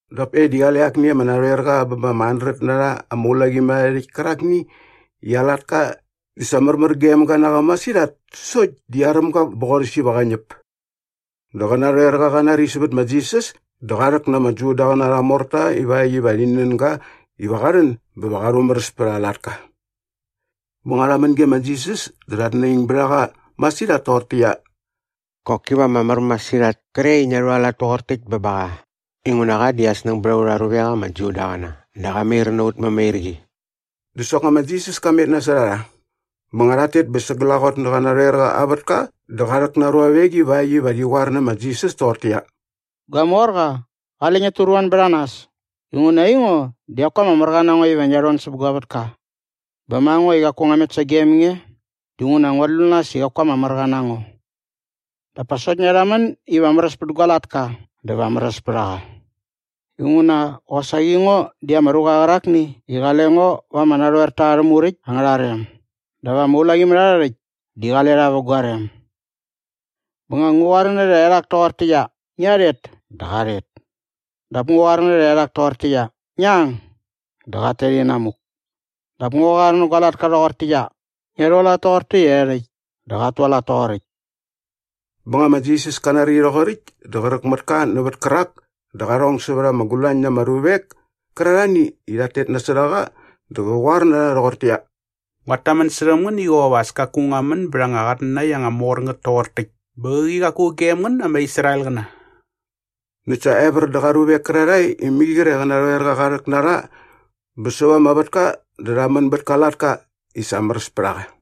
Dap e di qale akni ama narhoerqa bä ba ama handret na rha ama ulaqimärharhärhäkt kärakni i aa latka di sa märmär gem ga na qa masirhat sokt di aräm ga bä qorhäs iva qä ñäp. Dä qä narhoerqa qa nari sävät ma Jisas dä qa rhäk na ama Judaqäna arha morta ivakt iva rhi nän ga iva qa rhän bä qa rhumäräs pät aa latka. Bä nga rha män ge ma Jisas dä rhat naing bät a qa masirhat toqortäqyia, “Qoki va ama mär masirhat kre i ngia rhualat toqor täkt bä ba qa inguna qa di aa snäng bät aurha ruvek ama Judaqäna dä qa mair na ut mämairqi.” Dä soknga ma Jisas ka met kä na rha. Bä nga rhat tet bä sa glaqot nä qä narhoerqa aa vätka dä qa rhäk na aa ruavek ivakt iva rhi qoar nä ma Jisas toqortäqyia, “Gua morqa, qale ngiat turuan bät a nas inguna aingo di qaku ama märqa na ngo iva ngia rhon säp gua vätka. Bä ma ngo i qaku ngua met sagem nge dinguna nguat lu nas i qaku ama märqa na ngo. Dap pa sokt ngia rhamän iva märäs pät gua latka dä va märäs pät a qa. Inguna qosaqi ngo di ama ruqa qärakni i qale ngo va ama narhoerta arhä muräkt angärha rem dap ama ulaqimärharhärhäkt di qale rha vä gua rem. Bä nga ngu qoar nä rhaerhak toqortäqyia, ‘Ngia rhet’ dä qat tet. Dap nga ngu qoar nä rhaerhak toqortäqyia, ‘Ngi ang’ dä qat tet inamuk. Dap nga ngu qoar nä gua latka rhoqortäqyia, ‘Ngia rhualat toqortäqyia e rhäkt’ dä qat tualat toqoräkt.” Bä nga ma Jisas ka nari rhoqoräkt dä qräk mät ka nävät kärak dä qa rhong sävät ama gulañ na ama ruvek kärarhani i rhat tet nasot a qa dä qä qoar na rha rhoqortäqyia, “Nguat tamän särhäm ngän i qop as kaku ngua män bät anga qatnanakt anga mor ngät toqor täkt bä qäqi qaku gem ngän ama Israelqäna.” Näkt sa evär dä qa ruvek kärarhae i mai qre qä narhoerqa qa rhäk na rha bä säva ama vätka dä rha män bät ka latka i sa märäs pät a qa.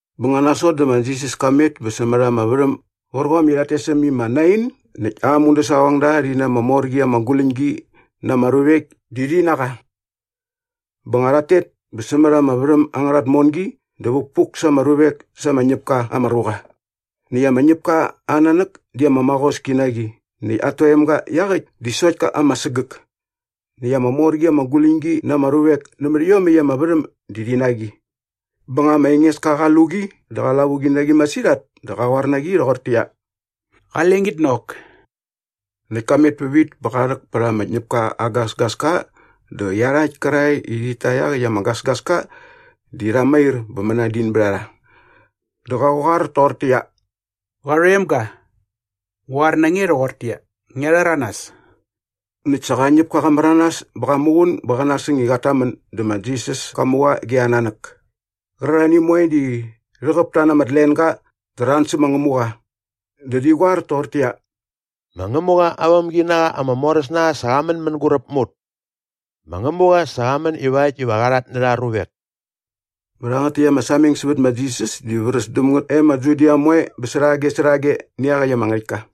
Bä nga nasot dä ma Jisas ka met bä sämät ama värhäm gärqom i rhat tes äm i ma Nain näkt aa mudäsaqongda rhi na ama mor qi ama guläñgi na ama ruvek di rhi na qa. Bä nga qat tet bä sämät ama värhäm angärha tmongi dä vukpuk sa ama ruvek sa ama ñäp ka ama ruqa. Näkt ama ñäpka aa nanäk di ama maqoski na qi näkt at toemga iaqäkt di sokt ka ama sägäk. Näkt ama mor qi ama guläñgi na ama ruvek nämät iomäkt ama värhäm di rhi na qi. Bä nga ma Engeska qa lu qi dä qa lavuqi na qi masirhat dä qä qoar na qi rhoqortäqyia, “Qale ngit nok.” Näkt ka met pävit bä qa rhäk pät ama ñäpka aa gasgaska dä iarhakt kärarhae i rhit ta iaqäkt ama gasgaska di rha mair bä mänadin bät a rha. Dä qä qoar toqortäqyia, “Qarhoemga, ngu qoar na nge rhoqortäqyia, ngia rhäranas.” Näkt sa qa ñäpka qa märanas bä qat muqun bä qä nasäng i qat tamän dä ma Jisas ka mu qa ge aa nanäk. Qärarhani moe di rhäqäp ta na ama tlenga dä rha an sä ma Ngämuqa. Dä rhi qoar toqortäqyia, “Ma Ngämuqa aa vämginaqa ama moräs na qa sa qa män mänguräp mä ut. Ma Ngämuqa sa qa män ivakt iva qa rhatnärha aa ruvek.” Bä rhangät täkt ama sameng sävät ma Jisas di vräs däm ngät e ma Judia moe bä särhage särhage nä iaqäkt ama ngärhäktka.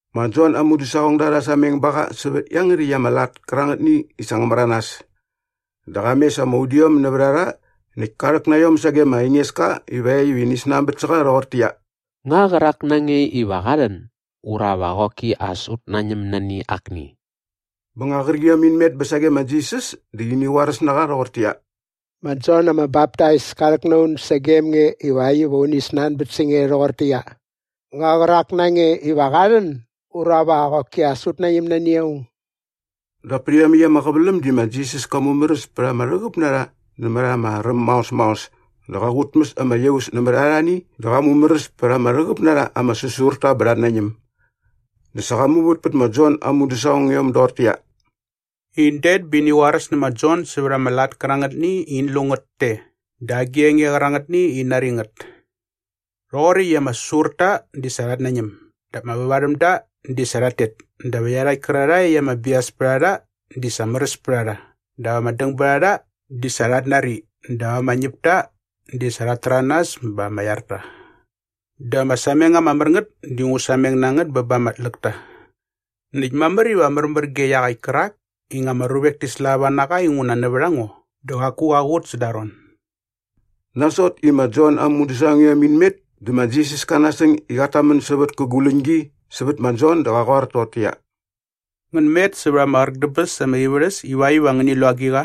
Ma Jon aa mudäsaqongda rha sameng ba qa sävät iangärhäkt ama lat moe qärangätni i sa ngä märanas. Dä qa mes ama udiom nävät a rha näkt ka rhäk na iom sage ma Engeska ivakt iva ini snanbät sä qa rhoqortäqyia, “Nga qärak na nge iva qa rhän ura va qoki as ut nañäm nani akni?” Bä nga qärqiom in met bä sage ma Jisas dä ini qoaräs na qa rhoqortäqyia, “Ma Jon ama Baptais ka rhäk na un sagem nge ivakt iva uni snanbät sä nge rhoqortäqyia, ‘Nga qärak na nge iva qa rhän ura va qoki as ut nañäm nani aung?’” Dap pät iomäkt ama qäväläm di ma Jisas ka mumäräs pät ama rhäqäp na rha nämät ama räm maos maos dä qa qutmäs ama iaus nämät arhani dä qa mumäräs pät ama rhäqäp na rha ama säsurta bä rhat nañäm. Dä sa qa muvät pät ma Jon aa mudäsaqongiom doqortäqyia, “In det bä ini qoaräs nä ma Jon sävät ama lat kärangätni i in lu ngät te dä agi enge qärangätni i in nari ngät. Rhoqoräkt i ama säsurta di sa rhat nañäm dap ama vävarhämda di sa rhat tet dap iarhakt kärarhae i ama bias pät a rha di sa märäs pät a rha dap ama dängbärharha di sa rhat nari dap ama ñäpta di sa rhat täranas bä ama iar ta. Dä ama sameng ama mär ngät di ngu sameng na ngät bä ba ama tläkta. Näkt mamär iva märmär ge iaqäkt kärak i nga ama ruvek ti slava na qa inguna nävät a ngo dä qaku qa qut säda aa ron.” Nasot i ma Jon aa mudäsaqongiom in met dä ma Jisas ka nasäng i qat tamän sävät kä guläñgi sävät ma Jon dä qä qoar toqortäqyia, “Ngän met sävät ama qräk dä bäs ama ivärhäs ivakt iva ngäni lu agiqa?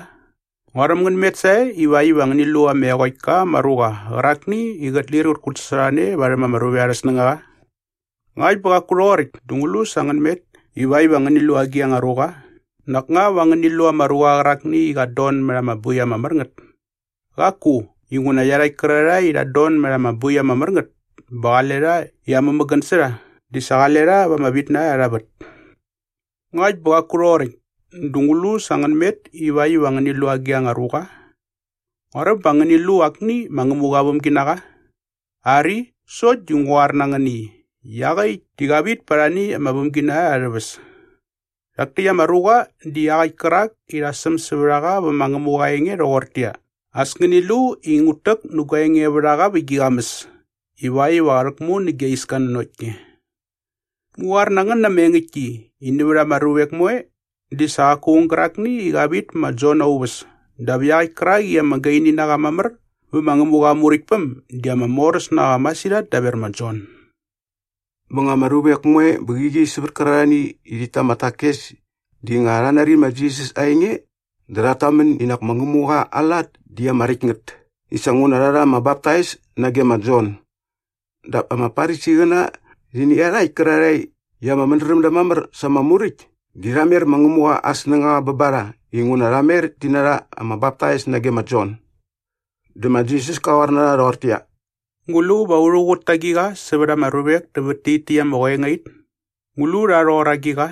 Nguaräm ngän met sae ivakt iva ngäni lu ama eqokt ka ama ruqa qärakni i qät lir qät kutsasorhane varhäm ama ruvek arhä snängaqa? Ngakt bä qaku rhoqoräkt dä ngu lu sa ngän met ivakt iva ngäni lu agi anga ruqa? Nak nga va ngäni lu ama ruqa qärakni i qat don mät ama boi ama mär ngät? Qaku, inguna iarhakt kärarhae i rhat don mät ama boi ama mär ngät bä qale rha i amämägän sä rha di sa qale rha va ama vitnarha arha vät. Ngakt bä qaku rhoqoräkt dä ngu lu sa ngän met ivakt iva ngäni lu agi anga ruqa? Nguaräm ba ngäni lu akni ma Ngämuqa aa vämginaqa? Ari, sokt di ngu qoar na ngän i iaqäkt di qa vit pät arhani ama vämginarha arhä väs. Rhak täkt ama ruqa di iaqäkt kärak i sa rha säm sävät a qa vä ma Ngämuqa aa enge rhoqortäqyia, “As ngäni lu i ngut täk nä gua engevärhaqa vä gi qamäs ivakt iva qä rhäkmu nä gia iska nanokt nge.” Ngu qoar na ngän na ama engäktki i nävät ama ruvek moe di sa qaku aung gärakni i qa vit pä ma Jon aa uväs dap iaqäkt kärak i ama gaini na qa mamär vä ma Ngämuqa aa Muräktpäm di ama moräs na qa masirhat daver ma Jon. Bä nga ama ruvek moe bä qäqi sävät kärarhani i rhit ta ama takes di nga rha nari ma Jisas aa enge dä rhat tamän i nak ma Ngämuqa aa lat di ama räkt ngät i sa nguna rha rha ama baptais nage ma Jon. Dap ama Farisiqäna rhi nä iarhakt kärarhae i ama mädräm da mamär sa ama Muräkt di rha mer ma Ngämuqa aa snängaqa bä ba rha inguna rha mer ti narha ama baptais nage ma Jon. Dä ma Jisas kä qoar toqortäqyia, “Ngu lu va ngua rhuqut ta agiqa sävät ama ruvek nävät tit täkt ama qoengait? Ngu lu rha rhoqor agiqa?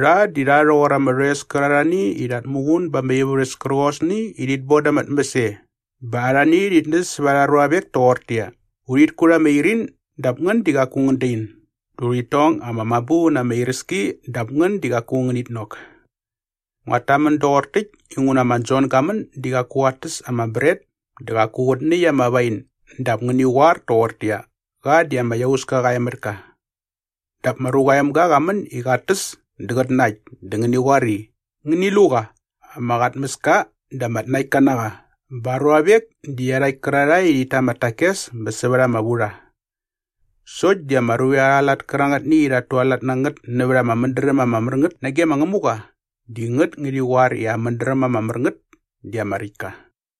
Rha di rha rhoqor ama rhoes kärarhani i rhat muqun ba ama ivärhäs kärqosni i rhit boda ama tmäs e bä arhani rhit näs sävät arha ruavek toqortäqyia, “‘Urhit kut ama irin dap ngän di qaku ngän dain dä urhit tong ama mabu na ama iräski dap ngän di qaku ngänit nok.’ Nguat tamän doqor täkt inguna ma Jon ga män di qaku qat täs ama bret dä qaku qät näkt ama wain dap ngäni qoar toqortäqyia, ‘Qa di ama iauska qa e mät ka.’ Dap ma Ruqa aa Emga qa män i qat täs dä qät nakt dä ngäni qoar i, ‘Ngäni lu qa. Ama qatmäska dä ama tnaktka na qa bä aa ruavek di iarhakt kärarhae i rhit ta ama takes bä sävät ama vurha!’ Sokt di ama ruvek arha lat kärangätni i rhat tualat na ngät nävät ama mädräm ama mär ngät nage ma Ngämuqa di ngät ngärhi qoar i aa mädräm ama mär ngät di ama räkt ka.”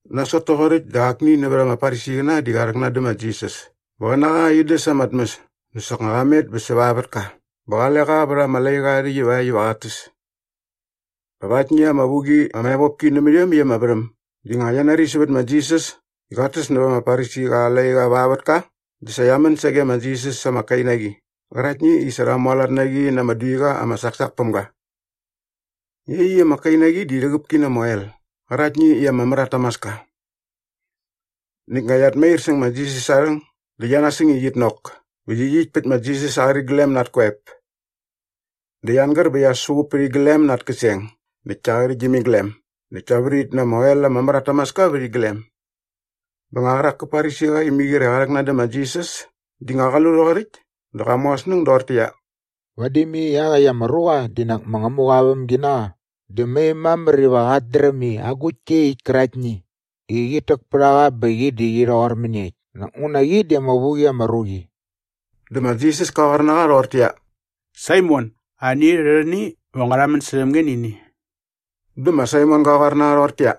Nasot toqoräkt dä akni nävät ama Farisiqäna di qa rhäknan dä ma Jisas iva qä na qa in däs ama tmäs dä soknga qa met bä säva aa vätka bä qale qa vät ama laiqa aa rhäkt ivakt iva qat täs. Dap aktni ama vu qi ama evopki nämät iomäkt ama värhäm di nga qia nari sävät ma Jisas i qat täs nävät ama Farisiqa aa laiqa va aa vätka dä sa qia män sage ma Jisas sa ama kainaqi qäraktni i sa rha mualat na qi na ama duiqa ama saksak päm ga. Iaqyäkt ama kainaqi di rhäqäp ki na ama oel qäraktni i ama mär at tamaska. Näkt nga qiat mair säng aa rhäng dä qia nasäng i qit nok bä qyiqyikt pät ma Jisas aa qäriglem na at koep. Dä qia angär bä qia suqup pät iglem na at käseng näkt kia qärhäktgyäm iglem näkt kia vrit na ama oel ama mär at tamaska vät iglem. Bä nga qärak kä Farisiqa i mai qre qa rhäknan dä ma Jisas di nga qa lu rhoqoräkt dä qa mu aa snäng doqortäqyia, “Vadi mai iaqäkt ama ruqa di nak ma Ngämuqa aa vämginaqa di mai mamär iva qat dräm i agukt koe iaqyäkt käraktni i qit täk pät a qa bä qi di qi rhoqor mäniekt nak nguna qi di ama vu qi ama ruqi.” Dä ma Jisas ka qoar na qa rhoqortäqyia, “Saimon, ani rhärhäni va ngua rhamän särhäm nge nä ini.” Dä ma Saimon ga qoar na qa rhoqortäqyia,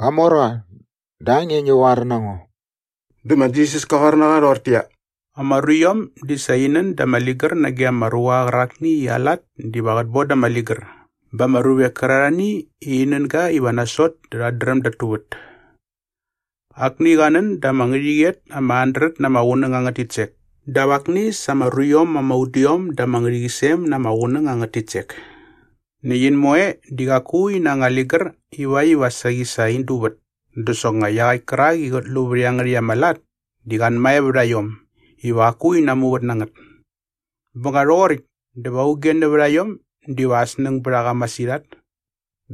“Qamorqa, dä a nge ngi qoar na ngo.” Dä ma Jisas kä qoar na qa rhoqortäqyia, “Ama ruiom di sa in nän da ama ligär nage ama ruqa qärakni i aa lat diva qät boda ama ligär bä ama ruvek kärarhani i rhi nän ga iva nasot dä rhat dräm dat tuvät. Akni qa nän da ama ngärhäqyet ama handret na ama qunäng angät titsek dap akni sa ama ruiom ama udiom da ama ngärhäqyisem na ama qunäng angät titsek. Näkt in moe di qaku ina anga ligär ivakt iva saqi sa in duvät dä soknga iaqäkt kärak i qät lu vät iangärhäkt ama lat di qa anmae vät a iom iva qaku in namuvät na ngät. Bä nga rhoqoräkt dä va auge nävät a iom diva aa snäng bät a qa masirhat?”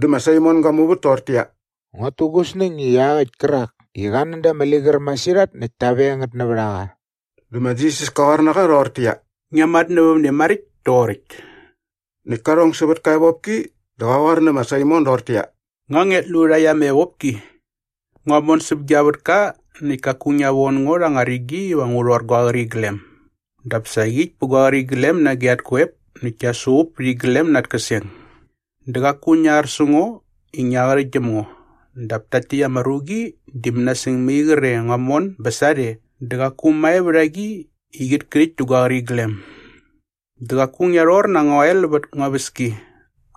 Dä ma Saimon ga muvät toqortäqyia, “Nguat tu gu snäng i iaqäkt kärak i qa nän da ama ligär masirhat näkt ta veng ngät nävät a qa.” Dä ma Jisas kä qoar nä qa rhoqortäqyia, “Ngia matnävämne maräkt toqoräkt.” Näkt ka rhong sävät ka evopki dä qä qoar nä ma Saimon doqortäqyia, “Nga ngiat lu rhakt ama evopki? Ngua mon säp gia vätka näkt kaku ngia von ngo rha anga rigi iva rhi rhor gua qäriglem. Dap sa qyikt pät gua qäriglem nage at koep näkt kia suqup pät iglem na at käseng. Dä qaku ngia ar sä ngo i ngia qärhäktgyäm ngo dap takt täkt ama ruqi di mänasäng mai qre ngua mon bä sarhe dä qaku mae vät a qi i qit kärhäkt dä gua qäriglem. Dä qaku ngia rhor na anga oel vät ngua väski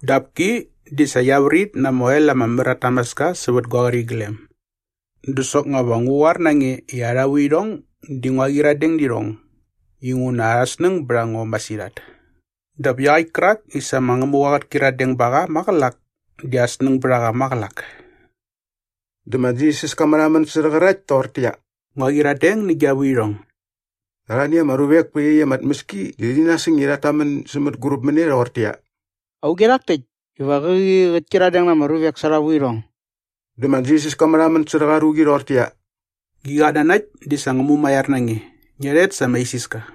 dap ki di sa qia vrit na ama oel ama mär at tamaska sävät gua qäriglem. Da soknga va ngu qoar na nge i arha vuirhong di ngua qyiradeng nä irhong inguna at snäng bät a ngo masirhat. Dap iaqäkt kärak i sa ma Ngämuqa qät kyiradeng ba qa maqälak di aa snäng bät a qa maqälak.” Dä ma Jisas ka märhamän särhä qärakt toqortäqyia, “Ngua qyiradeng nä gia vuirhong.” Dä arhani ama ruvek pä iaqyäkt ama tmäski di rhi nasäng i rhat tamän sä mänguräp mä ne rhoqortäqyia, “Auge rhak täkt iva qäqi qät kyiradeng na ama ruvek sa arha vuirhong?” Dä ma Jisas ka märhamän särhä qa ruqi rhoqortäqyia, “Gi qatnanakt di sa ngä mumaiar na nge. Ngia rhet sa ama isiska.”